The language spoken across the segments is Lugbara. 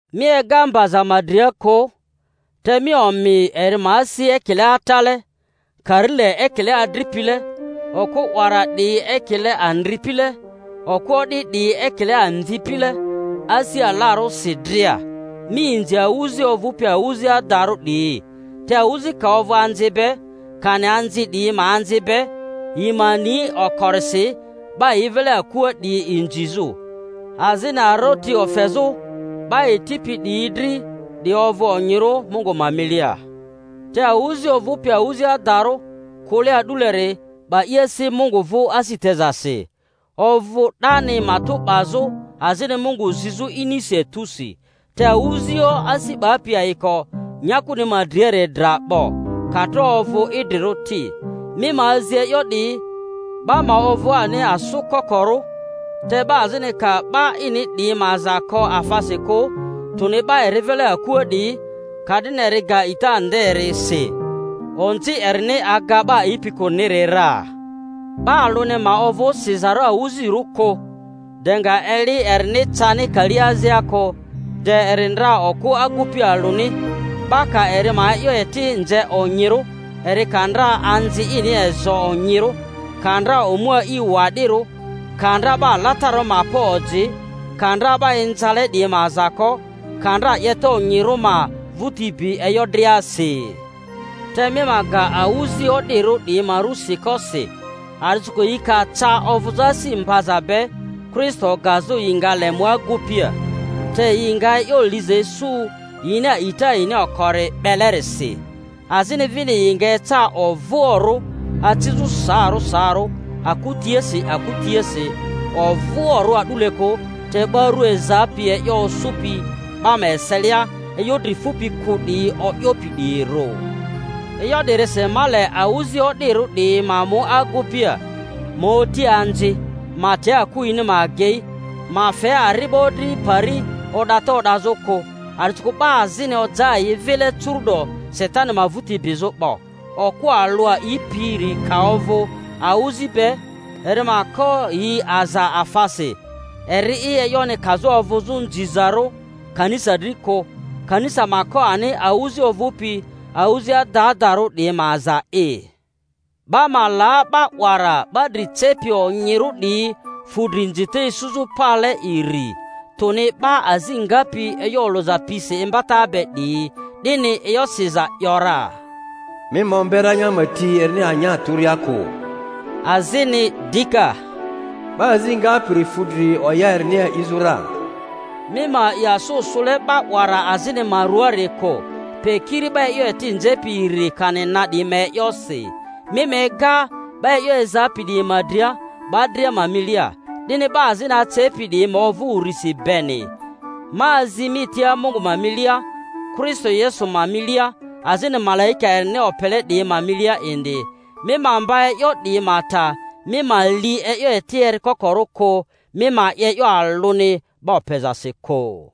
Mi ega mbazaᴜ ma dria kᴜ, te mi omi eri ma asi ekile atale; karile ekile adripile, okᴜ 'wara 'diyi ekile andripile, okᴜ o'di 'diyi ekile amvipile, asi alarᴜsi dria. Mi inzi awᴜzi ovᴜpi awᴜzi adarᴜ 'diyi. Te awᴜzi ka ovᴜ anzi be, kani anzi 'diyi ma anzi be, yi ma ni okorisi 'ba yi vile akua 'diyi inzizᴜ, azini aroti ofezᴜ 'ba yi tipi 'diyi dri; 'di ovᴜ onyirᴜ Mungu ma milia. Te awᴜzi ovᴜpi awᴜzi adarᴜ, kᴜle a'duleri, 'ba i asi Mungu vᴜ asi tezasi, ovᴜ 'dani matᴜ 'bazᴜ azini Mungu zizᴜ inisi etusi; te awᴜ-zioᴜ asi 'bapi ayiko nyakuni ma driari dra 'bo, ka tro ovᴜ idrirᴜ ti. Mi ma azi e'yo 'diyi, 'ba ma ovᴜ ani asᴜ kokorᴜ. Te 'ba azini ka 'ba ini 'diyi ma aza ko afasi kᴜ, tᴜni 'ba eri vile akua 'diyi, ka'dini eri ga a'ita nderi si, onzi erini aga 'ba a'ipi kᴜriniri ra. 'Ba alᴜni ma ovᴜ sizarᴜ awᴜzirᴜ kᴜ de nga eli erini cani kali azia kᴜ, de eri ndra okᴜ agupi alᴜni; 'ba ka eri ma e'yo eti nze onyirᴜ, eri ka ndra anZi ini ezo onyirᴜ, ka ndra omu a'i wa'dirᴜ, ka ndra 'ba alatararᴜ ma pa oji, ka ndra 'ba inzale 'diyi ma aza ko, ka ndra 'yeta onyirᴜ ma vᴜti bi e'yo driasi. Te mi ma ga awᴜzi o'dirᴜ 'diyi ma ru siko si, a'disikᴜ yi ka ca ovᴜzᴜ asi mbaza be Kristo gazᴜ yi nga le mu agupia, te yi nga e'yo liza isu yini a'ita yini okori 'belerisi. Azini vini yi nga eca ovᴜoᴜrᴜ, acizᴜ saarᴜ saarᴜ aku tiasi aku tiasi; ovoᴜrᴜ a'dule kᴜ, te 'ba ru ezapi e'yo osᴜpi 'ba ma eselia, e'yo dri fupi kᴜ 'diyi o'yopi 'diyirᴜ. E'yo 'dirisi ma le awᴜzi o'dirᴜ 'diyi ma mu agupia, ma oti anzi, ma te aku yini ma agei, ma fe ari'bo dri pari o'data o'dazᴜ kᴜ. A'disikᴜ 'ba azini oja yi vile curu'do Satani ma vᴜti bizᴜ 'bo. Okᴜ alᴜ a'ipiri ka ovᴜ awᴜzi be, eri ma ko yi aza afasi eri'i, e'yoni kazᴜ ovᴜzᴜ nzizarᴜ kanisa dri kᴜ; kanisa ma ko ani awᴜzi ovᴜpi awᴜzi adadarᴜ 'diyi ma aza'i. 'Ba ma la 'ba 'wara 'ba dri cepi onyirᴜ 'diyi fudri inzita isuzᴜ pale iri, tᴜni 'ba azi ngapi e'yo olᴜza pisi imbata be 'diyi; 'dini e'yo siza ‘yora, Mi ma ombe ranya ma ti erini anya tᴜria kᴜ, azini dika, 'Ba azi ngapiri fᴜ dri oya erini a'izᴜ ra. Mi ma a'i asᴜ sᴜle 'ba 'wara azini ma ruaari kᴜ, pe kiri 'ba e'yo eti nzepi iri kani na 'diyi ma e'yosi. Mi ma ega 'ba e'yo ezapi 'diyi ma dria 'ba dria ma milia, 'dini 'ba azini acepi 'diyi ma ovᴜ urisi beni. Ma azi mi tia Mungu ma milia, Kristo Yesu ma milia, azini malaika erini opele 'diyi ma milia indi, mi ma mba e'yo 'diyi ma ta, mi ma li e'yo eti erikokorᴜ kᴜ, mi ma 'ye e'yo alᴜni 'ba opezasi kᴜ.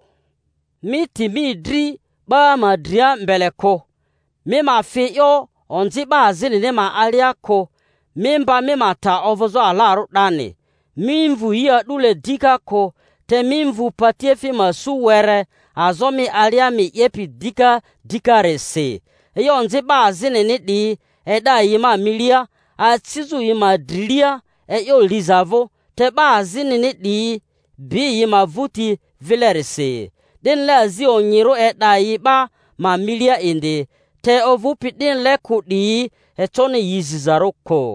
Mi ti mi dri 'ba ma dria mbele kᴜ, mi ma fi e'yo onzi 'ba azinini ma alia kᴜ; mi mba mi ma ta ovᴜzᴜ alarᴜ 'dani. Mi mvu yi a'dule dika kᴜ, te mi mvu patiefi ma su were, azo mi alia mi 'yepi dika dikarisi. E'yo onzi 'ba azinini 'diyi e'da yi 'ba ma milia, acizᴜ yi ma drilia e'yo liza vᴜ, te 'ba azinini 'diyi bi yi ma vᴜti vilerisi. 'Dinile azi onyirᴜ e'da yi 'ba ma milia indi; te ovᴜpi 'dinile kᴜ 'diyi, econi yi zizarᴜ kᴜ.